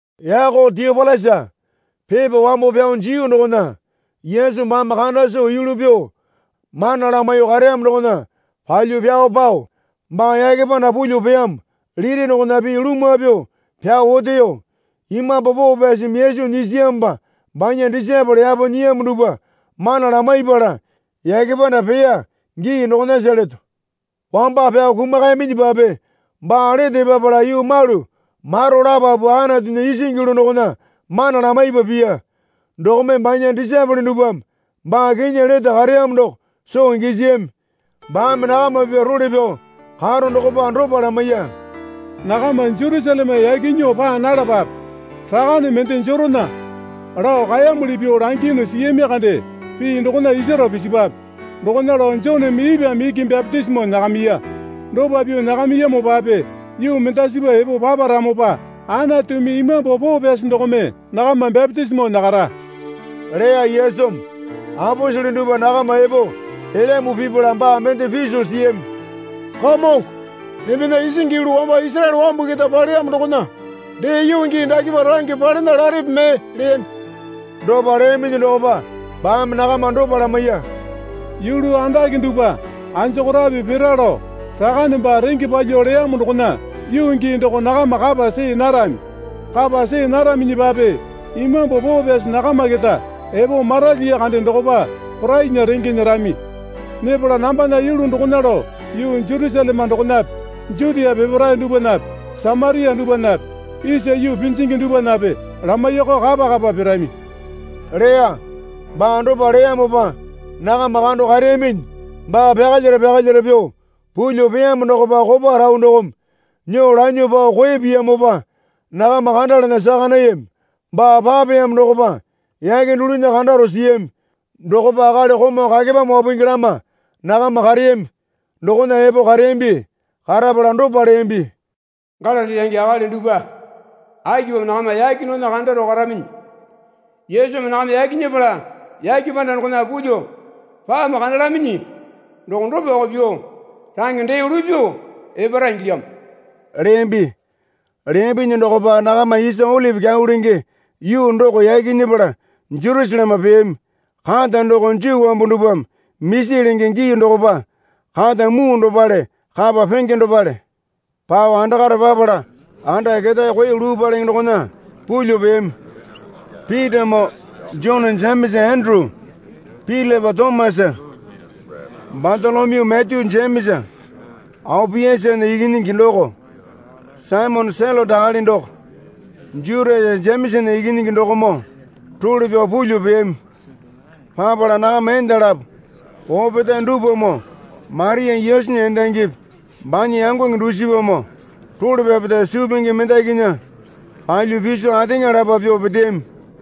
Yako Tiopilasa, Pepa wambo pyao jiyu dokona Yesu baame kanda soo yulu pyuo mana lamaiyuo kareyamo dokona palyuo pyao pao baa yake panda pulyuo peyamo liti dokona pii lumwa pyuo pyao oteyo. Imambu Poo Pyasimi Yesu nyisiyamopa banya disaepole yapo nyiyamo dupwa mana lamaipala yake panda peya gii dokonasa leto. Wamba pyao kumakayaminyipape baa lete epapala yuu malu maro lapapu Anatunya isingi yulu dokona mana lamaipa piya. Dokome banya disaepole dupwame baa kinyi lete kareyamo doko soo gisiyami. Baame nakama pipya role pyao karo dokopa dopa lamaiya. Nakama Jerusaleme yaki nyuo paa nalapape. Rakane mende jerona lao kaeyamuli pyuo langiyunu siyami kande pii dokona isaro pisipwape. Dokona lao Joneme ipwame iki bapitisimo nyakamiya. Dopa pyuo nyakamiyamopape yuu mendasipa epo paparamopa Anatumi Imambu Poo Pyasi dokome nakama bapitisimo nyakara, leya Yesumi. Aposele dupwa nakama epo elyambu pipala baa mende piso siyami. Kamongo, embena isingi yulu wamba Isaraele wambu keta paleyamo dokona dee yuu gii dakepa range palena larepe mee? leyami. Dopa leyaminyi dokopa baame nakama dopa lamaiya. Yulu andake dupwa anjokorape pira lao Rakane baa renge palyuo leyamo dokona yuu gii doko nakama kapa see narami. Kapa see naraminyipape Imambu Poo Pyasi nakama keta epo maralyiya kande dokopa porainya renge nyerami. Nyepala nambana yulu dokona lao yuu Jerusaleme dokonape Jutia peparae dupwanape Samaria dupwanape isa yuu pinjingi dupwanape lamaiyakao kapa kapa pirami leya. Baa dopa leyamopa nakama kando kareyaminyi baa pyakalyara pyakalyara pyuo pulyuo peyamo dokopa kopa rau dokome nyuo lanyuo pao koe piyamopa nakama kandalana saka nayami. Baa papeyamo dokopa yake dulunya kandaro siyami. Dokopa akali komau kakepame wapungi dalama nakama kareyami dokona epo kareyambi. Karapala dopa leyambi. Galili range akali dupwa, akipamo nakama yake dokona kandaro karaminyi? Yesumi nakama yaki nyepala yake panda dokona pulyuo pamo kandalaminyi doko dopako pyuo range dee lupyuo epara ingilyamo leyambi. Leyambinyi dokopa nakama isa Olipi Kyau lenge, yuu doko yaki nyepala Jerusaleme peyami. Kata doko Juu wambu dupwame misi lenge gii dokopa kata muu dopale kapa penge dopale. Pao andakare papala anda ketae koe luu palenge dokona pulyuo peyami. Pitamoo Jone Jemesa Enduru Pilipa Tomasa Batolomyu Matyu Jemesa Aopiasana ikinyingi doko, Saimone Selote akali doko, Jutasa Jemesana ikinyingi dokomoo role pyao pulyuo peyami. Papala nakama enda lapo opetae dupwamoo Maria Yesunya endangipi banya yangonge dusipamoo role pyapeta suu pingi mendakinya palyuo piso ateŋa lapa pyuo peteyami.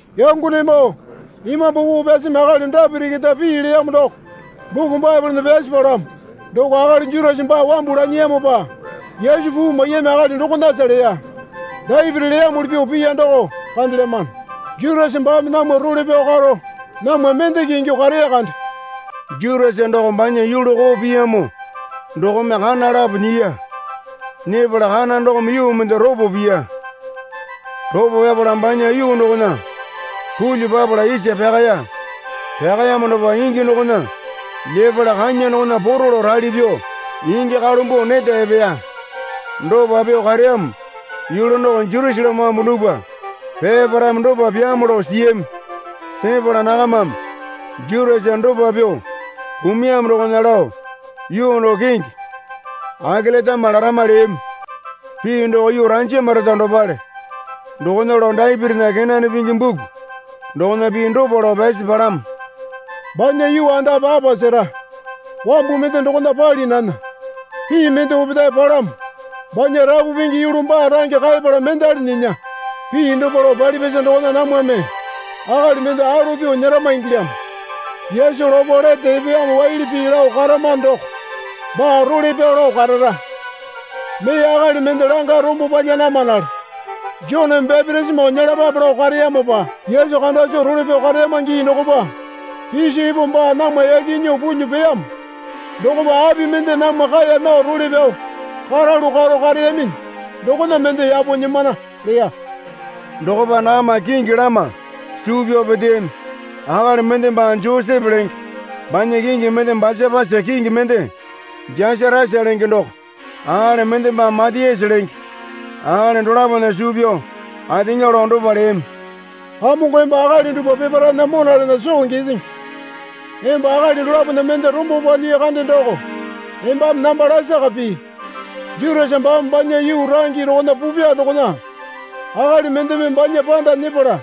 Yangonemoo, Imambu Poo Pyasimi akali Dapiti keta pii leyamo doko buku Baepolena pyasi palamo. Doko akali Jutasa baa wambu lanyiyamopa Yesu puu maiyami akali dokonasa leya. Dapiti leyamuli pyuo piya doko kandelyamano. Jutasa baame namwa role pyao karo namwa mendeke ingyuo kareya kande. (Jutasa doko banya yulu koo piyamo dokome kana lapo nyiya. Nyepala kana dokome yuu mende ropo piya. Ropo pyapala banya yuu dokona pulyuo papala isa pyakaya. Pyakayamo dokopa ingi dokona lyepala kanya dokona poro lao rali pyuo ingi kalumbuo neta epeya. Dopa pyuo kareyamo yulu doko Jerusaleme wambu dupwa peparaeme dopa pyaamo lao siyami. Sepala nakamame Jutasa dopa pyuo kumuyamo dokona lao yuu doko kingi Akeletama larama leyami. Pii doko Yuu Ranjamareta dopale.) Dokona lao Dapitinya kenane pingi buku dokona pii dopa lao pyasi palamo. Banya yuu andape apa sera, wambu mende dokona pali nana. Pii mende opetae palamo, Banya rapu pingi yulu baa range kaepala mendali nyinya. Pii dopa lao palipyasa dokona namwame akali mende alo pyuo nyerama ingilyamo. Yesu lopo lete epeyamo waili pii lao karamano doko baa role pyao lao karara. Mee akali mende langa rombo palya namanale Joneme bapitisimo nyelapape lao kareyamopa Yesu kanda soo role pyao kareyama gii dokopa piso epo baa namwa yaki nyuo pulyuo peyamo dokopa api mende namwa kaeya nao role pyao karalu karo kareyaminyi dokona mende yapo nyimana, leya. Dokopa nakama kingi lama suu pyao peteyami. Akali mende baa Josepe lenge banya kingi mende Basapasa, kingi mende Jasatasa lenge doko. Akali mende baa Matayasa lenge. Akali dolapona suu pyao ateŋa lao dopa leyami. Kamongo emba akali dupwa peparaena monarena soo gisingi. Emba akali dolapona mende rombo palyii kande doko embame namba lasaka pii. Jutasa baame banya yuu range dokona pupya dokona akali mendeme banya panda nyepala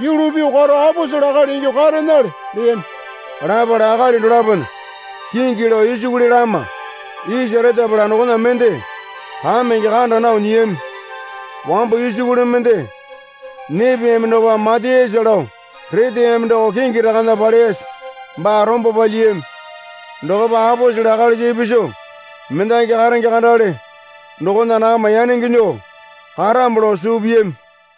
yulu pyuo karo aposele akali ingyuo karenale, leyami. Lapala akali dolapona kingi lao isukuli lama isa retapala dokona mende kamenge kanda nao nyiyami. Wambo isukuli mende nyepeyami dokopa Matayasa lao reteyami doko kingi rakana paleyasa baa rombo palyiyami. Dokopa aposele akalisa ipisu mendaki karenge kandale dokona nakama yanenge nyuo karamo lao suu piyami.